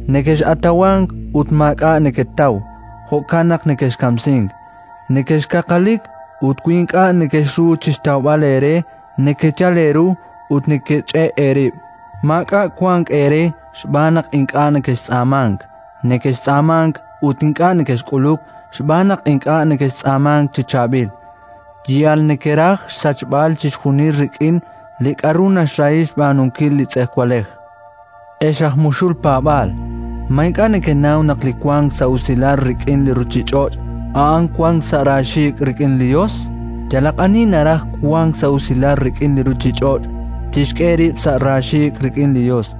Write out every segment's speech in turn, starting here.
Nekex'atawank, ut maak'a' neketaw; jo'kan naq nekexkamsink. Nekexkaqalik, ut wi ink'a' nekexru chi xtawb'al eere, nekeyal eeru ut nekech'e' eerib'. Maak'a' wank eere xb'aan naq ink'a' nekextz'aamank. Nekextz'aamank ut ink'a' nekexk'uluk xb'aan naq ink'a' nekextz'aamank chi chaab'il: yal nekeraj xsachb'al chixjunil rik'in li k'aru naxrahi xb'aanunkil li tz'ejwalej. Ex aj muxul paab'aal! Ma ink'a' nekenaw naq li wank sa' usilal rik'in li ruuchich'och', a'an wank sa' raaxiik' rik'in li Yos? Yalaq ani naraj wank sa' usilal rik'in li ruuchich'och', tixk'e rib' sa' raaxiik' rik'in li Yos.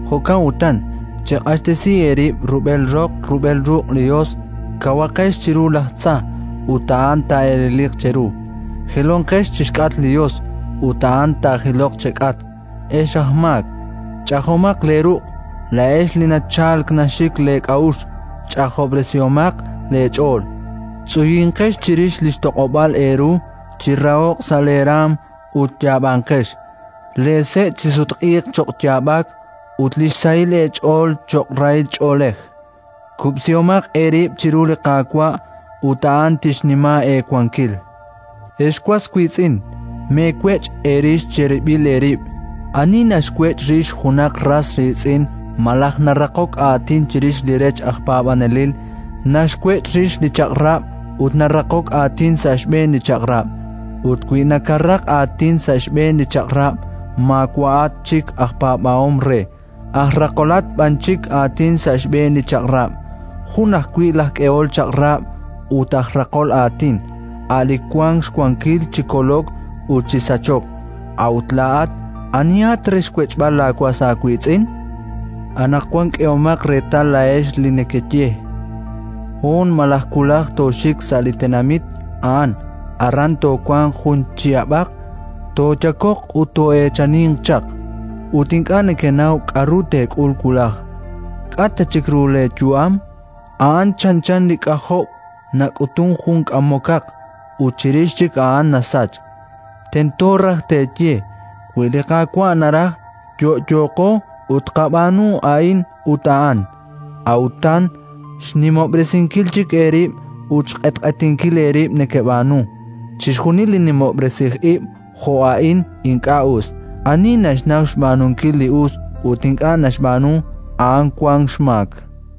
Jo'kan utan, cheq'axtesi eerib' rub'el roq rub'el ruq' li Yos; kawaqex chiru laj tza, ut a'an taa'eleliq cheru. Jilonqex chi xk'atq li Yos, ut a'an taajiloq chek'atq. Ex aj maak, ch'ajomaq leeruq'. Laa'ex li nachalk naxik leek'a'uxl, ch'ajob'resihomaq leech'ool. Tz'uyinqex chirix li xtoq'ob'aal eeru, chiraho'q sa' leeraanm ut yaab'anqex. Leese' chisutq'iiq cho'q yaab'ak, ut li xsahilal eech'ool cho'q rahil ch'oolej. Kub'sihomaq eerib' chiru li Qaawa', ut a'an tixnima eewankil. Ex was wiitz'in, meewech' eerix cherib'il eerib'. Ani naxwech' rix junaq ras riitz'in malaj naraqok aatin chirix li rech aj paab'anelil, naxwech' rix li Chaq'rab' ut naraqok aatin sa' xb'een li Chaq'rab'; ut wi nakaraq aatin sa' xb'een li Chaq'rab', maawa'at chik aj paab'ahom re, aj raqolat b'an chik aatin sa' xb'een li Chaq'rab'. Jun ajwi' laj k'ehol chaq'rab' ut aj raqol aatin, a' li wank xwankil chi kolok ut chi sachok. A'ut laa'at anihat re xwech'b'al laawas aawiitz'in? Anaqwan k'ehomaq reetal laa'ex li nekeye: “Hoon malaj wulaj tooxik sa' li tenamit a'an; aran toowanq jun chihab'aq, tooyakoq ut too'eechaninq chaq”, ut ink'a' nekenaw k'aru teek'ul wulaj. K'a' ta chik ru leeyu'am? A'an chanchan li k'ajob' nak'utunk jun k'amokaq, ut chirix chik a'an nasachk. Tento raj teeye: “Wi li Qaawa' naraj, yo'yooqo ut tqab'aanu a'in ut a'an”. A'utan xnimob'resinkil chik eerib' ut xq'etq'etinkil eerib' nekeb'aanu. Chixjunil li nimob'resij ib' jo' a'in, ink'a' us. Ani naxnaw xb'aanunkil li us ut ink'a' naxb'aanu, a'an wank xmaak.